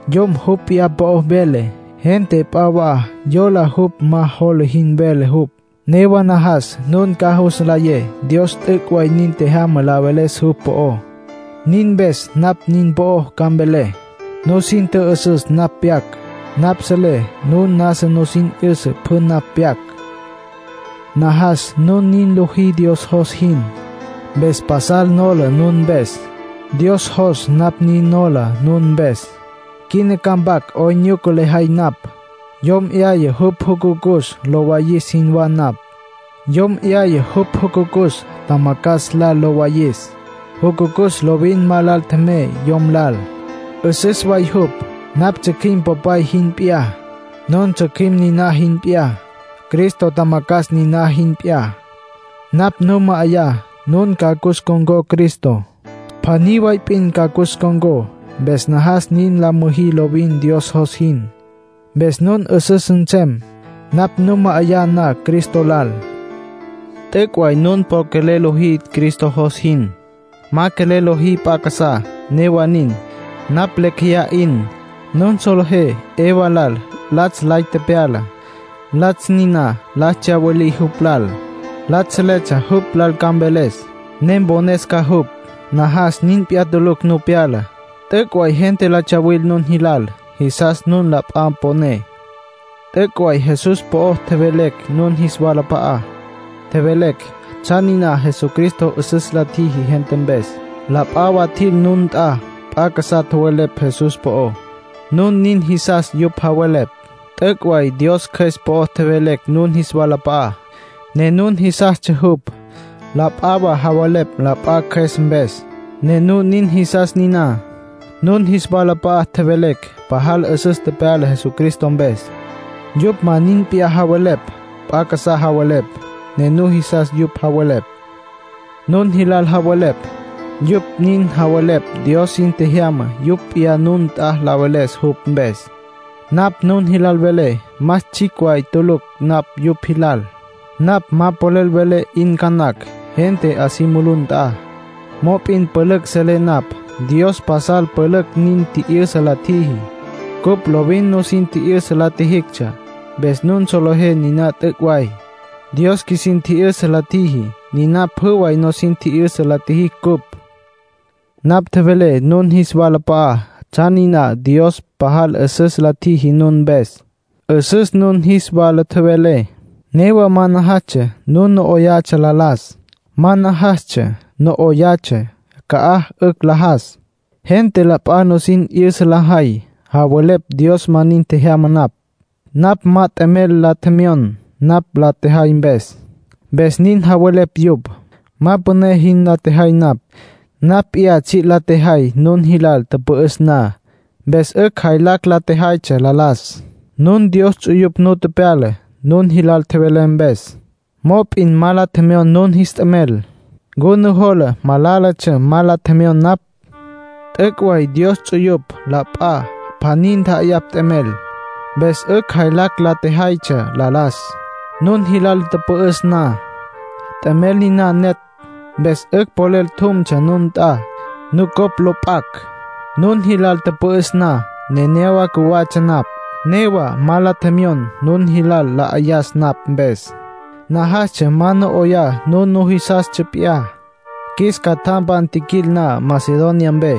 Yom jupj p'iyá po'o vele, gente p'a wa yola jupj ma jola jin vele jupj. Newa najas nun ca jus nlayé Dios t'üc' way nin tjejyama la veles jupj po'ó; nin mpes napj nin po'o ca mvelé. Nusin tjü'üsüs napj pyac. Napj selé nun nasa nusin 'yüsa pjü napj pyac. Najas nun nin lojí Dios jos jin, mpes pasal nola nun mpes. Dios jos napj nin nola nun mpes. Quina ca mpac 'oyn nyuca lejay napj. Yom 'yaya jupj jucucus lo wayis jinwá napj. Yom 'yaya jupj jucucus tjamacjas lal lo wayis. Jucucus lovin ma lal tjemey yom lal; 'üsüs way jupj. Napj tsjücjüim popay jin p'iyá; nun tsjücjüim niná jin p'iyá; Cristo tjamacjas niná jin p'iyá. Napj nun ma'ayá, nun ca cus ncon̈có Cristo; pjaní way p'in ca cus ncon̈có. Mpes najas nin la müjí lovin Dios jos jin. Mpes nun 'üsüs nsem, napj nun ma'ayá na Cristo lal. T'üc' way nun po quelel lojí Cristo jos jin. Ma quelel lojí p'a casá. Newa nin, napj lecj jeyá 'in. Nun solejé Eva lal latsj lay tepyala. Latsj niná la tsyawilí jupj lal. Latsj seletsja jupj lal ca mveles, ne mpones ca jupj. Najas nin p'iyá tulucj nu pyala. T'üc' way gente la tsuwil nun jilal, jisas nun la p'a poné. T'üc' way Jesús po'o tjevelecj nun jis walap'a'á. Tjevelecj tsjan niná Jesucristo 'üsüs la tjiji gente mpes. La p'a wa tjil nun nt'a, p'a casá tjowelepj Jesús po'ó. Nun nin jisas yupj javelepj. T'üc' way Dios Cjües po'o tjevelecj nun jis walap'a'á, ne nun jisastsja jupj. La p'a wa javelepj la p'a cjües mpes, ne nun nin jisas niná. Nun jis walap'a'a tjevelecj pajal 'üsüs tepyala Jesucristo mpes. Yupj ma nin p'iyá javelepj. P'a casá javelepj, ne nujisas yupj javelepj. Nun jilal javelepj, yupj nin javelepj Dios sin tjejyama yupj p'iyá nun nt'a la veles jupj mpes. Napj nun jilal velé más tsjicj way tulucj napj yupj jilal. Napj ma polel velé 'in ca nacj, gente 'a si mulú nt'a. Mop'in pülücj selé napj. Dios pasal pülücj nin tji'yüsa la tjiji. Cupj lovin nusin tji'yüsa la tjijictsja, mpes nun solejé niná t'üc' way. Dios qjuisin tji'yüsa la tjiji, niná pjü way nusin tji'yüsa la tjijicj cupj. Napj tjevelé nun jis walap'a'á tsjan niná Dios pajal 'üsüs la tjiji nun mpes. 'Üsüs nun jis wala tjevelé, newa ma najastsja nun no 'oyatsja la las, ma najastsja no 'oyatsja ca'aj 'ücj la jas. Gente la p'a nusin 'yüsa lajay, javelepj Dios ma nin tjejyama napj. Napj ma t'emel la tjemyon napj la tjejay mpes, mpes nin javelepj yupj. Ma püné jin la tjejay napj. Napj p'iyá tsji' la tjejay nun jilal tüpü'üs na, mpes 'ücj jaylacj la tjejaytsja la las. Nun Dios ts'uyupj nu tepyala, nun jilal tjevelé mpes. Mop'in ma la tjemyon nun jis t'emel. ¿Ncu nujola malálatsja ma la tjemyon napj? T'üc' way Dios ts'uyupj la p'a pjaní ntja'ayapj t'emel, mpes 'ücj jaylacj la tjejaytsja la las, nun jilal tüpü'üs na. T'emel niná netj, mpes 'ücj polel tjumtsja nun nt'a, nucopj lo p'acj. Nun jilal tüpü'üs na, nenéyawa cjuwatsja napj, newa ma la tjemyon nun jilal la 'ayas napj mpes. Najastsja ma no 'oyá nun nujisastsja p'iyá. Qjuis catjampan tjiquil na Macedonia mpe,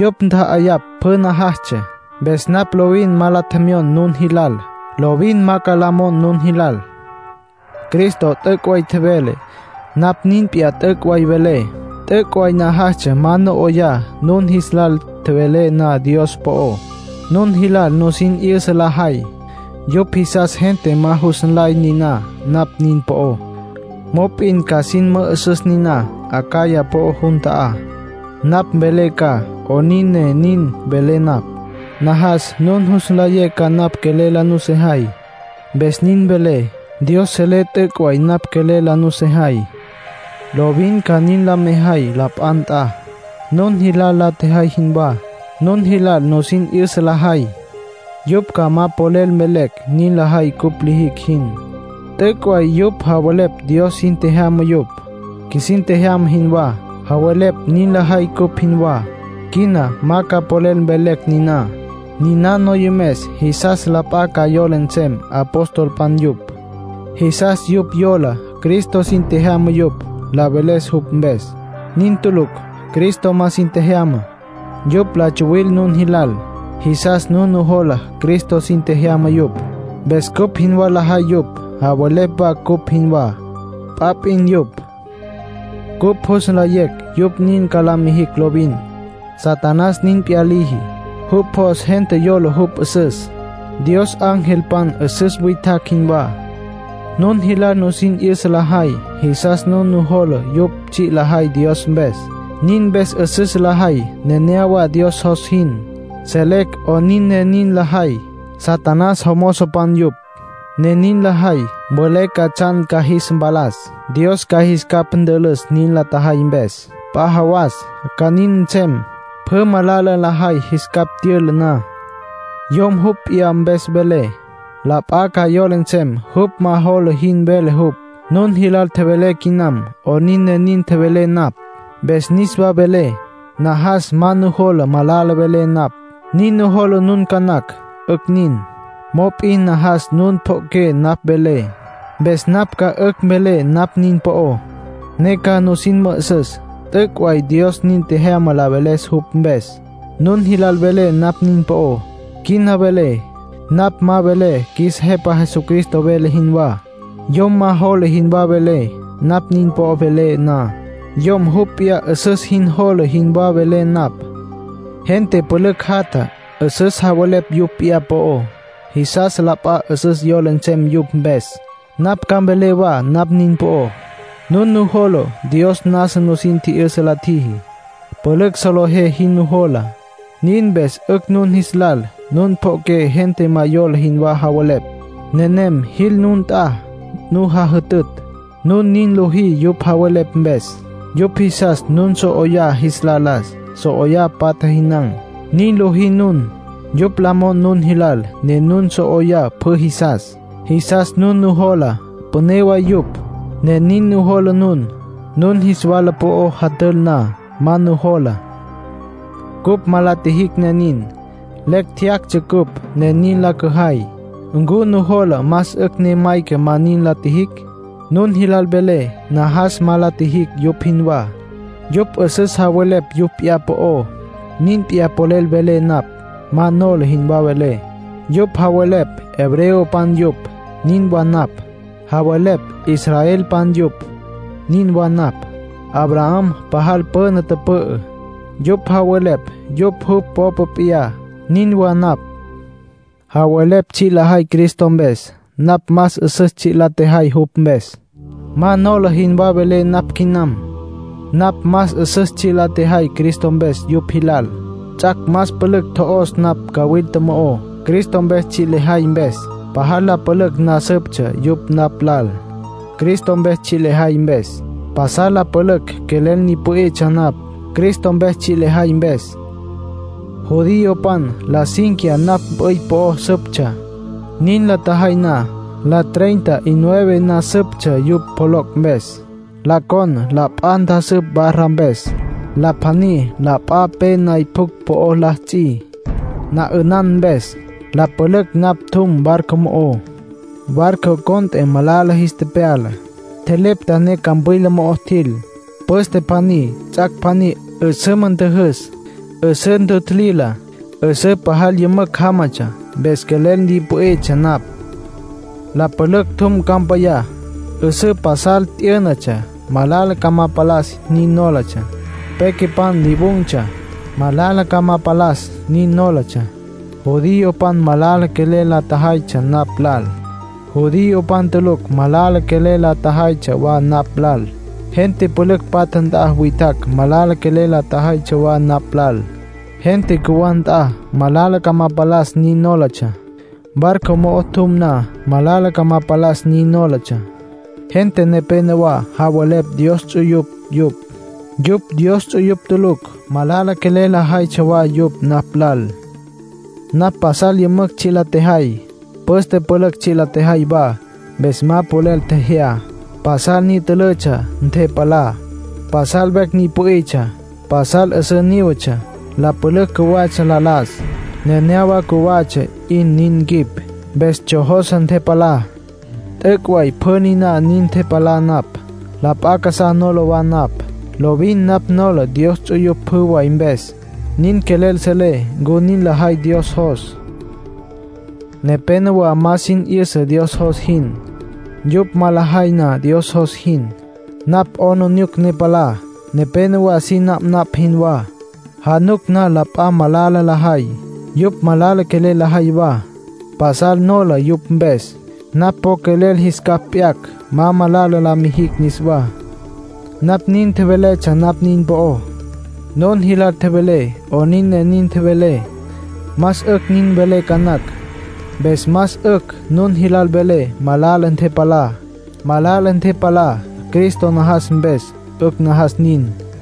yupj ntja'ayapj pjü najastsja. Mpes napj lovin ma la tjemyon nun jilal. Lovin ma ca la mon nun jilal. Cristo t'üc' way tjevele, napj nin p'iyá t'üc' way velé. T'üc' way najastsja ma no 'oyá, nun jis lal tjevelé na Dios po'ó. Nun jilal nusin 'yüsa lajay, yupj jisas gente ma jus nlay niná napj nin po'ó. Mop'in ca sin mü'üsüs niná Acaya po'ó jun ta'á. Napj mvelé ca 'onin ne nin velé napj. Najas nun jus nlayé ca napj quelel la nusejay, mpes nin velé. Dios selé t'üc' way napj quelel la nusejay. Lovin ca nin la mejay la p'a nt'a, nun jilal la tjejay jinwá. Nun jilal nusin 'yüsa lajay, yupj ca ma polel mvelecj nin lajay cupj lijicj jin. T'üc' way yupj javelepj Dios sin tjejyama yupj, qjuisin tjejyama jinwá. Javelepj nin lajay cupj jinwá. Quina ma ca polel mvelecj niná. Niná noyomes jisas la p'a ca yola nsem apostolpan yupj, jisas yupj yola Cristo sin tjejyama yupj, la veles jupj mpes. Nin tulucj. Cristo ma sin tjejyama. Yupj la tsuwil nun jilal. Jisas nun nujola Cristo sin tjejyama yupj, mpes cupj jinwá lajay yupj, javelepj wa cupj jinwá. P'a p'in yupj. Cupj jus nlayecj yupj nin ca la mijicj lovin. Satanás nin p'iyá liji. Jupj jos gente yola jupj 'üsüs, Dios angelpan 'üsüs witjacj jinwá. Nun jilal nusin 'yüsa lajay, jisas nun nujola yupj tsji' lajay Dios mpes; nin mpes 'üsüs lajay nenéyawa Dios jos jin. Selecj 'onin ne nin lajay. Satanás jomozopan yupj, ne nin lajay. Mvelé ca tsjan ca jis mpalas. Dios ca jis capj ntülüs nin la tjajay mpes. P'a jawas ca nin nsem, pjü malala lajay jis capj tyüla na. Yom jupj p'iyá mpes vele, la p'a ca yola nsem jupj ma jola jin vele jupj. Nun jilal tjevelé quinam 'onin ne nin tjevelé napj. Mpes niswa velé, najas ma nujola malala velé napj. Nin nujola nun ca nacj. 'Ücj nin; mop'in najas nun pjo'oqué napj velé. Mpes napj ca 'ücj mvelé napj nin po'ó, ne ca nusin mü'üsüs t'üc' way Dios nin tjejyama la veles jupj mpes. Nun jilal velé napj nin po'ó. Quina velé, napj ma velé qjuis Jepa Jesucristo vele jinwá. Yom ma jola jinwá velé, napj nin po'o velé na. Yom jupj p'iyá 'üsüs jin jola jinwá velé napj. Gente pülücj jatja, 'üsüs javelepj yupj p'iyá po'ó, jisas la p'a 'üsüs yola nsem yupj mpes. Napj ca mvelé wa napj nin po'ó. Nun nujola Dios nasa nusin tji'yüsa la tjiji; pülücj solejé jin nujola. Nin mpes 'ücj nun jis lal nun pjo'oqué gente ma yola jinwá javelepj. Nenem jil nun nt'a, nu jajütütj. Nun nin lojí yupj javelepj mpes. Yupj jisas nun so 'oyá jis la las, so 'oyá patja, jinan̈. Nin lojí nun. Yupj la mon nun jilal, ne nun so 'oyá pjü jisas. Jisas nun nujola püné way yupj, ne nin nujola nun. Nun jis wala po'o jatül na, ma nujola. Cupj ma la tjijicj ne nin. Lecj tjeyactsja cupj ne nin la cüjay. ¿Ncu nujola más 'ücj ne mayca ma nin la tjijicj? Nun jilal velé najas ma la tjijicj yupj jinwá. Yupj 'üsüs javelepj yupj p'iyá po'ó; nin p'iyá polel velé napj. Ma nola jinwá velé. Yupj javelepj hebreopan yupj. Nin wa napj. Javelepj israelpan yupj. Nin wa napj. Abraham pajal püna tüpü'ü, yupj javelepj yupj jupj popa p'iyá. Nin wa napj. Javelepj tsji' lajay Cristo mpes. Napj más 'üsüs tsji' lejay jupj mpes. Ma nola jinwá velé napj quinam. Napj más 'üsüs tsji' la tjejay Cristo mpes yupj jilal. Ts'ac' más pülücj tjo'os napj cawilta mo'ó, Cristo mpes tsji' lejay mpes. Pajal la pülücj na süptsja yupj napj lal, Cristo mpes tsji' lejay mpes. Pasal la pülücj quelel ni pü'itsja napj, Cristo mpes tsji' lejay mpes. Judiopan la cínquiya napj mp'üy po'o süptsja. Nin la tjajay na, la treinta y nueve na süptsja yupj pjoloc' mpes. La con la p'a ntjasüp barra mpes. La pjaní la p'a pe nay pjucj po'ó la ts'i, na 'ünan mpes. La pülücj napj tjum barco mo'ó. Barco cont'e malala jis tepyala. Tjelepta ne campwila mo'o tjil. Püste pjaní, ts'ac' pjaní, 'üsüma tjüjüs, 'üsǘ ntjutjilila. 'Üsǘ pajal yümücj jámatsja, mpes quelel ni pü'itsja napj. La pülücj tjum campayá. 'Üsǘ pasal t'yǘnatsja, malala ca ma palas nin nólatsja. Pequepan lyawun̈tsja, malala ca ma mpalas nin nólatsja. Judiopan malala quelel la tjajaytsja napj lal. Judiopan tulucj malala quelel la tjajaytsja wa napj lal. Gente pülücj patja nt'a witjacj malala quelel la tjajaytsja wa napj lal. Gente cjuwá nt'a, malala ca ma palas nin nólatsja. Barco mo'o tjum na, malala ca ma palas nin nólatsja. Gente nepénowa javelepj Dios ts'uyupj yupj, yupj Dios ts'uyupj tulucj. Malala quelel la jaytsja wa yupj napj lal. Napj pasal yümücj tsji' la tjejay. Püste pülücj tsji' la tjejay wa, mpes ma polel tjejyá. Pasal ni' ntúlatsja ntepalá. Pasal vecj ni pü'itsja. Pasal 'üsǘ nívetsja. La pülücj cjuwatsja la las. Nenéyawa cjuwatsja 'in nin quip, mpes tsjojose ntepalá. T'üc' way pjü niná nin ntepalá napj. La p'a casá nola wa napj. Lovin napj nola Dios ts'uyupj pjü way mpes. Nin quelel selé ncu nin lajay Dios jos. Nepénowa ma sin 'yüsa Dios jos jin. Yupj ma lajay na Dios jos jin, napj 'aplijila ne palá. Nepénowa sin napnapj jinwá; januc na la p'a malala lajay, yupj malala quelel lajay wa. Pasal nola yupj mpes. Napj po quelel jis capj p'yacj, ma malala la mijicj niswá. Napj nin tjeveletsja napj nin po'ó; nun jilal tjevelé 'onin ne nin tjevelé. Más 'ücj nin velé ca nacj. Mpes más 'ücj nun jilal velé malala ntepalá. Malala ntepalá Cristo najas mpes, 'ücj najas nin.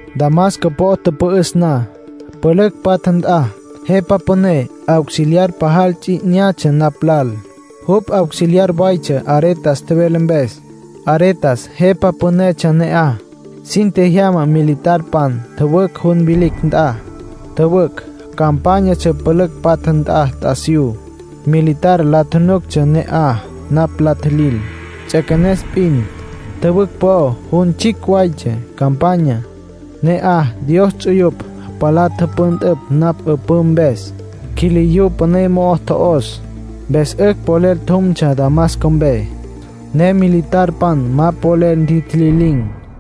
Damasco po'o tüpü'üs na, pülücj patja nt'a, jepa püné auxiliar pajal ts'i 'inyatsja napj lal. Jupj auxiliar waytsja Aretas tjevele mpes, Aretas jepa pünetsja ne'aj. Sin tjejyama militarpan tjüwücj jun vilicj nt'a. Tjüwücj campányatsja pülücj patja nt'a t'asiyú. Militar la nuctsja ne'aj napj la tjilil. Ts'üequenes p'in. Tjüwücj po'o jun tsjicj waytsja campanya. Ne'aj Dios ts'uyupj palá tüpüntüpj napj 'üpǘ mpes, quiliyú püné mo'o tjo'os. Mpes 'ücj polel tjumtsja Damasco mpe, ne militarpan ma polel ntjitjililin̈.